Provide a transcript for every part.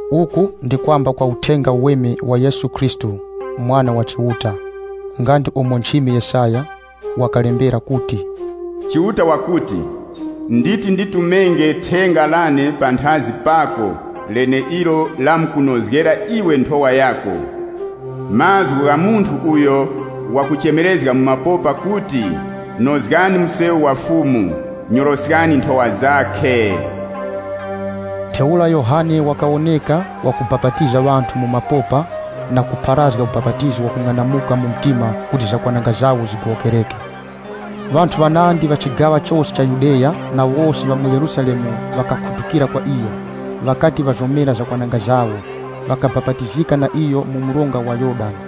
Uku ndi kwamba kwa Uthenga Uweme wa Yesu Khristu, Mwana wa Chiuta. Nga ndi umo nchimi Yesaya wakalembera kuti, “Chiuta wakuti, ‘Wonani, nditi nditume thenga lane panthazi pako leneilo lamkunozgera iwe nthowa yako.’ Mazgu gha munthu wakuchemerezga mu mapopa kuti, ‘Nozgani msewu wa Fumu, nyoroskani nthowa zakhe!’” (LXX) Ntheura Yohane Mubapatizi wakawoneka mu mapopa, wakupharazga ubapatizo wakung'anamuka mu mtima kuti zakwananga zigowokereke. Ŵanthu ŵanandi ŵa chigaŵa chose cha Yudeya na wose ŵa mu Yerusalemu ŵakakhutukira kwa iyo. Ŵakati ŵazomera zakwananga zawo, ŵakabapatizika na iyo mu mronga wa Yorodani.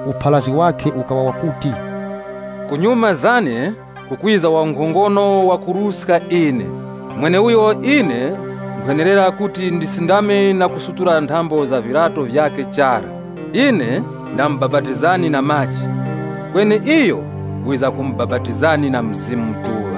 Upharazgi wakhe ukaŵa wakuti, “Kunyuma zane kukwiza wankhongono wakuruska ine, mweneuyo ine nkhwenerera kuti ndisindame na kusutula nthambo za viryato vyakhe chara. Ine nkhumubapatizani na maji, kweni iyo wizamkumubapatizani na Mzimu Mutuŵa.”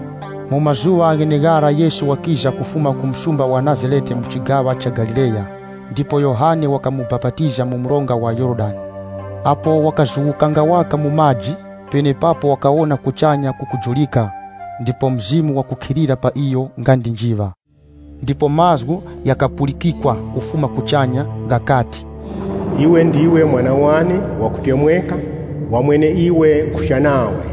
Mu mazuŵa gheneghara Yesu wakiza kufuma ku msumba wa Nazarete mu chigaŵa cha Galileya, ndipo Yohane wakamubapatiza mu mronga wa Yorodani. Apo wakazuwukanga waka mu maji, penepapo wakawona kuchanya kukujurika, ndipo Mzimu wakukhilira pa iyo nga ndi njiŵa. Ndipo mazgu ghakapulikikwa kufuma kuchanya ghakati, “Iwe ndiwe Mwana wane wakutemweka, wa mweneiwe nkhucha nawe.”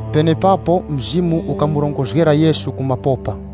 Penepapo Mzimu ukamurongozgera Yesu ku mapopa.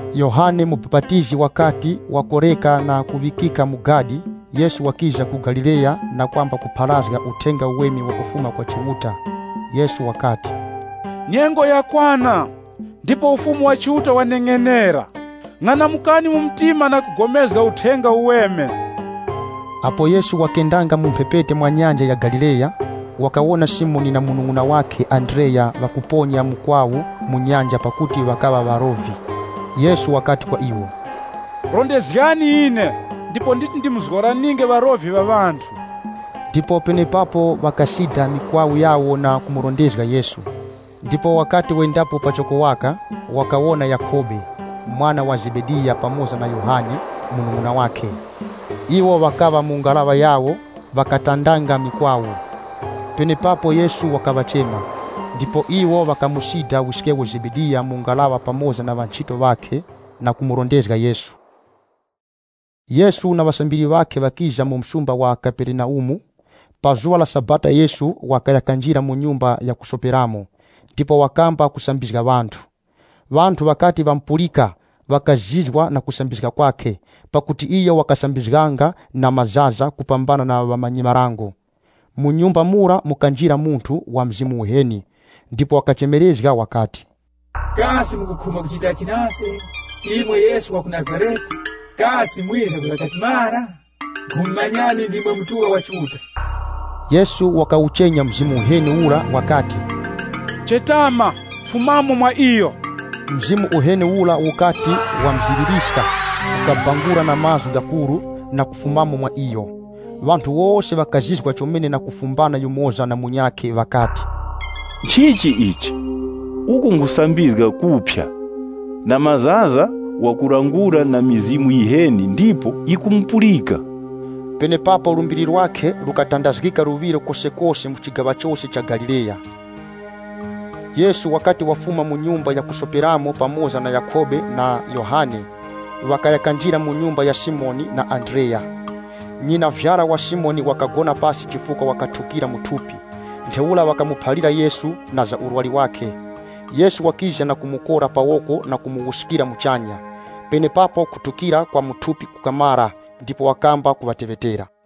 Yohane Mubapatizi wakati wakoreka na kuŵikika mu gadi, Yesu wakiza ku Galileya na kwamba kupharazga Uthenga Uweme wakufuma kwa Chiuta. Yesu wakati, “Nyengo yakwana, ndipo Ufumu wa Chiuta waneng'enera. Ng'anamukani mu mtima na kupulikana na Uthenga Uweme.” Apo Yesu wakendanga mu mphepete mwa Nyanja ya Galileya, wakawona Simoni na munung'una wakhe Andreya ŵakuponya mukwawu mu nyanja pakuti ŵakaŵa ŵarovi. Yesu wakati kwa iwo, “Rondezgani ine, ndipo nditi ndimuzgoraninge ŵarovi ŵa ŵanthu.” Ndipo penepapo ŵakasida mikwawu yawo na kumurondezga Yesu. Ndipo wakati wendapo pachoko waka, wakawona Yakhobe, mwana wa Zebediya pamoza na Yohane, munung'una wakhe. Iwo ŵakaŵa mu ngaraŵa yawo, ŵakatandanga ŵakatandanga: Ŵanandi ŵakuti “kugambika”. mikwawu. Penepapo Yesu wakaŵachema. Ndipo iwo ŵakamusida wiskewo Zebediya mu ngaraŵa pamoza na ŵanchito ŵakhe, na kumurondezga Yesu. Yesu na ŵasambiri ŵakhe ŵakiza mu msumba wa Kaperenaumu. Pa zuŵa la Sabata Yesu wakaya kanjira mu nyumba ya kusoperamo, ndipo wakamba kusambizga ŵanthu. Ŵanthu ŵakati ŵamupulika, ŵakazizwa na kusambizga kwakhe, pakuti iyo wakasambizganga na mazaza kupambana na ŵamanyi-marango. Mu nyumba mura mukanjira munthu wa mzimu uheni, ndipo wakachemerezga wakati, “Kasi mukukhumba kuchitachi nase ise, imwe Yesu wa ku Nazarete? Kasi mwiza kwiza katimara? Nkhumumanyani, ndimwe Mutuŵa Yura wa Chiuta!” Yesu wakawuchenya mzimu uheni ura wakati, “Chetama, fumamo mwa iyo!” Mzimu uheni ura wukati wamziririska, ukabangura na mazgu ghakuru na kufumamo mwa iyo. Ŵanthu wose ŵakazizwa chomene na kufumbana yumoza na munyakhe ŵakati, “Nchichi ichi? Uku nkhusambizga kuphya! Na mazaza, wakulangula na mizimu yiheni ndipo yikumupulika!” Penepapo lumbiri lwakhe lukatandazgika luŵiro kosekose mu chigaŵa chose cha Galileya. Yesu wakati wafuma mu nyumba ya kusoperamo pamoza na Yakhobe na Yohane, ŵakaya kanjira mu nyumba ya Simoni na Andreya. Nyinavyara wa Simoni wakagona pasi chifukwa wakathukira mu thupi. Ntheura ŵakamuphalira Yesu na za urwari wakhe. Yesu wakiza na kumukora pa woko na kumuwuskira muchanya. Penepapo kuthukira kwa mu thupi kukamara ndipo wakamba kuŵateŵetera.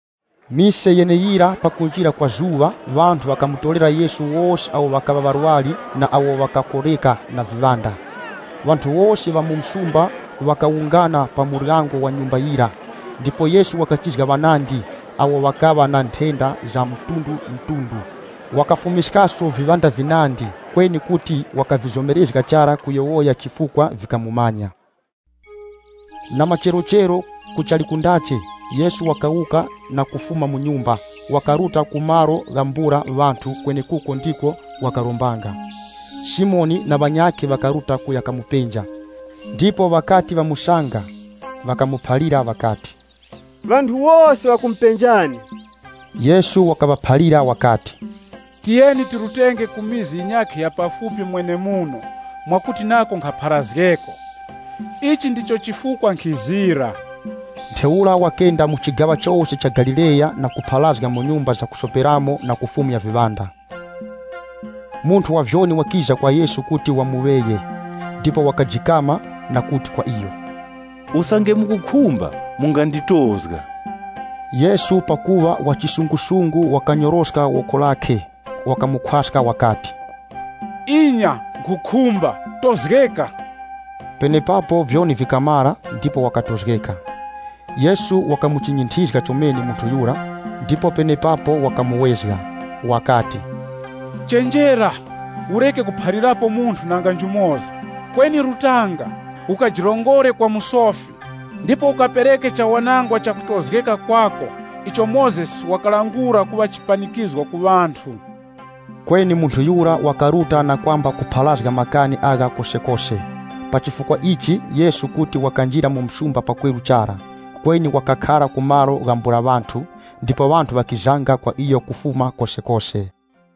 Mise yeneyira pakunjira kwa zuŵa, ŵanthu ŵakamutorera Yesu wose awo ŵakaŵa ŵarwari na awo ŵakakoreka na viŵanda. Ŵanthu wose ŵa mu msumba ŵakawungana pa muryango wa nyumba yira. Ndipo Yesu wakachizga ŵanandi awo ŵakaŵa na nthenda za mtundumtundu. Wakafumiskaso viŵanda vinandi, kweni kuti wakavizomerezga chara kuyowoya chifukwa vikamumanya. Na macherochero kuchali kundache, Yesu wakawuka na kufuma mu nyumba, wakaruta ku malo ghambula ŵanthu kwenekuko ndiko wakarombanga. Simoni na ŵanyakhe ŵakaruta kuya kamupenja. Ndipo ŵakati ŵamusanga, ŵakamuphalira ŵakati, “Ŵanthu wose ŵakumupenjani.” Yesu wakaŵaphalira wakati, “Tiyeni tirutenge ku mizi yinyakhe ya pafupi mwenemuno mwakuti nako nkhapharazgeko. Ichi ndicho chifukwa nkhizira.” Ntheura wakenda mu chigaŵa chose cha Galileya na kupharazga mu nyumba zakusoperamo na kufumya viŵanda. Munthu wa vyoni wakiza kwa Yesu kuti wamuŵeye, ndipo wakajikama na kuti kwa iyo, “Usange mukukhumba, munganditozga.” Yesu pakuŵa wa chiwuravi wakanyoroska woko lakhe, wakamukhwaska wakati, “Inya, nkhukhumba, tozgeka!” Penepapo vyoni vikamara ndipo wakatozgeka. Yesu wakamuchinyinthizga chomene munthu yura ndipo penepapo wakamuwezga na kuti, “Chenjera, ureke kuphalirapo munthu nanga njumoza. Kweni rutanga, ukajirongore kwa musofi, ndipo ukapereke chawanangwa chakutozgeka kwako icho Mozesi wakalangula kuŵa chipanikizgo ku ŵanthu.” Kweni munthu yura wakaruta na kwamba kupharazga makani agha kosekose. Pa chifukwa ichi, Yesu kuti wakanjira mu muzi pakweru chara. Kweni wakakhara ku malo ghambula ŵanthu, ndipo ŵanthu ŵakizanga kwa iyo kufuma kosekose.